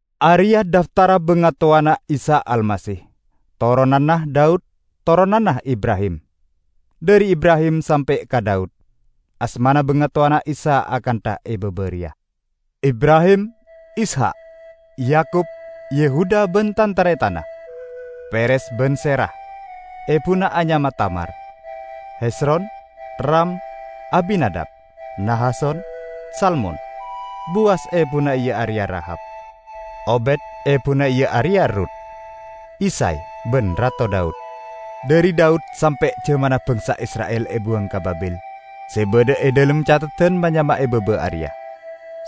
Areya' dhaftarra bangatowana Isa Almasih, toronanna Daud, toronanna Ibrahim. Dhari Ibrahim sampe' ka Daud, asmana bangatowana Isa akantha e baba reya: (2-6a) Ibrahim Ishak, Yakub, Yehuda ban tan-taretanna, Peres ban Zerah (ebuna anyama Tamar), Hezron, Ram, Aminadab, Nahason, Salmon, Bowas (ebuna iya areya Rahab), Obed (ebuna iya areya Errut), Isay, ban Rato Daud. ( b-11) Dhari Daud sampe' jamanna bangsa Isra'il ebuwang ka Babil, se badha e dhalem catheddan ma-nyama e baba areya: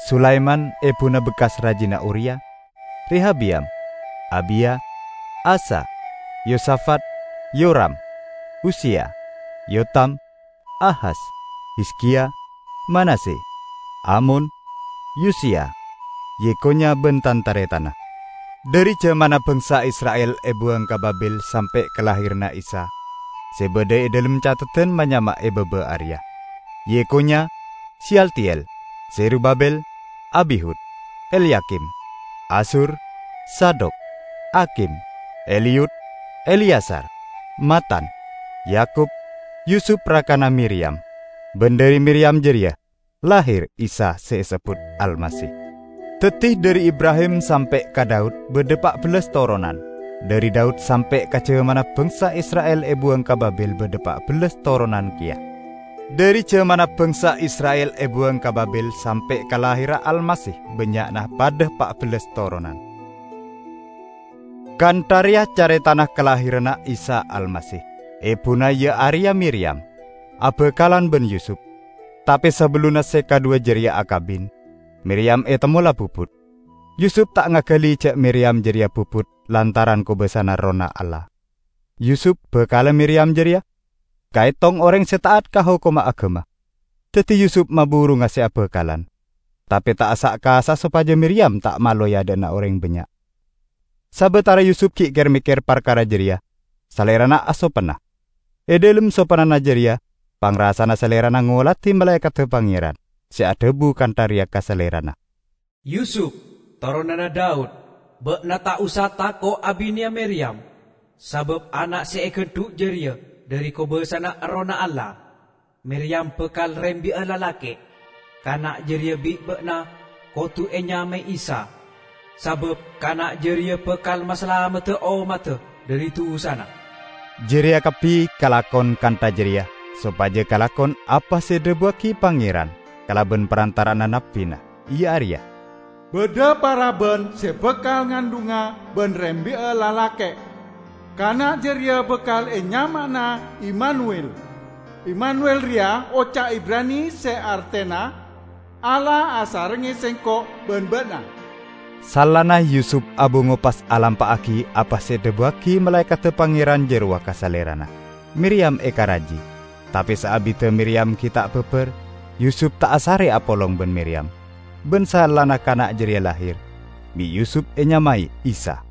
Sulaiman (ebuna bekkas rajina Uriya), Rehabeyam, Abiya, Asa, Yosafat, Yoram, Uziya, Yotam, Ahas, Hizkiya, Manasye, Amon, Yosiya, Yekhonya ban tan-taretanna. 12Dhari jamanna bangsa Isra'il ebuwang ka Babil sampe' kalahiranna Isa, se badha e dhalem catheddan ma-nyama e baba areya: Yekhonya, Seyaltiel, Zerubabil, Abihud, Elyakim, Azur, Zadok, Akhim, Eliyud, Eleyazar, Matan, Yakub, Yusup rakana Miriyam. Ban dhari Miriyam jareya lahir Isa se esebbut Almasih. 17Daddi dhari Ibrahim sampe' ka Daud badha pa' bellas toronan. Dhari Daud sampe' ka jamanna bangsa Isra'il ebuwang ka Babil badha pa' bellas toronan keya. Dhari jamanna bangsa Isra'il ebuwang ka Babil sampe' ka lahirra Almasih bannya'na padha pa' bellas toronan. 18Kantha reya caretana kalahiranna Isa Almasih. Ebuna iya areya Miriyam, abakalan ban Yusup. Tape sabellunna se kadhuwa jareya akabin, Miriyam etemmo la bubut. Yusup ta' ngagali ja' Miriyam jareya bubut lantaran kobasana Errohna Allah. 19Yusup, bakalla Miriyam jareya, kaetong oreng se ta'at ka hokomma agama. Daddi Yusup maburunga se abakalan, tape ta' asa'-kasa'a sopaja Miriyam ta' malo e adha'na oreng bannya'. 20Sabatara Yusup gi' ker-mekker parkara jareya, salerana asopenna. E dhalem sopennana jareya pangrasana salerana ngoladi malaekadda Pangeran se adhabu kantha reya ka salerana, "Yusup, toronanna Daud, ba'na ta' osa tako' abineya Miriyam, sabab ana' se egandhu' jareya dhari kobasana Errohna Allah. 21Miriyam bakal rembi'a lalake'. Kana' jareya bi' ba'na kodu enyamae Isa, sabab kana' jareya bakal masalamedda ommadda dhari dusana." 22Jareya kabbi kalakon kantha jareya sopaja kalakon apa se edhabuwagi Pangeran kalaban parantara'anna nabbina, iya areya, 23"Badha paraban se bakal ngandhunga ban rembi'a lalake'. Kana' jareya bakal enyama'ana Immanuwil." (Immanuwil reya oca' Ibrani se artena "Allah asarengnge sengko' ban ba'na".) 24Saellana Yusup abungo pas alampa'agi apa se edhabuwagi malaekadda Pangeran jarowa ka salerana. Miriyam ekaraji. 25Tape saabidda Miriyam gi' ta' babar, Yusup ta' asare apolong ban Miriyam. Ban saellana kana' jareya lahir, bi' Yusup enyamae Isa.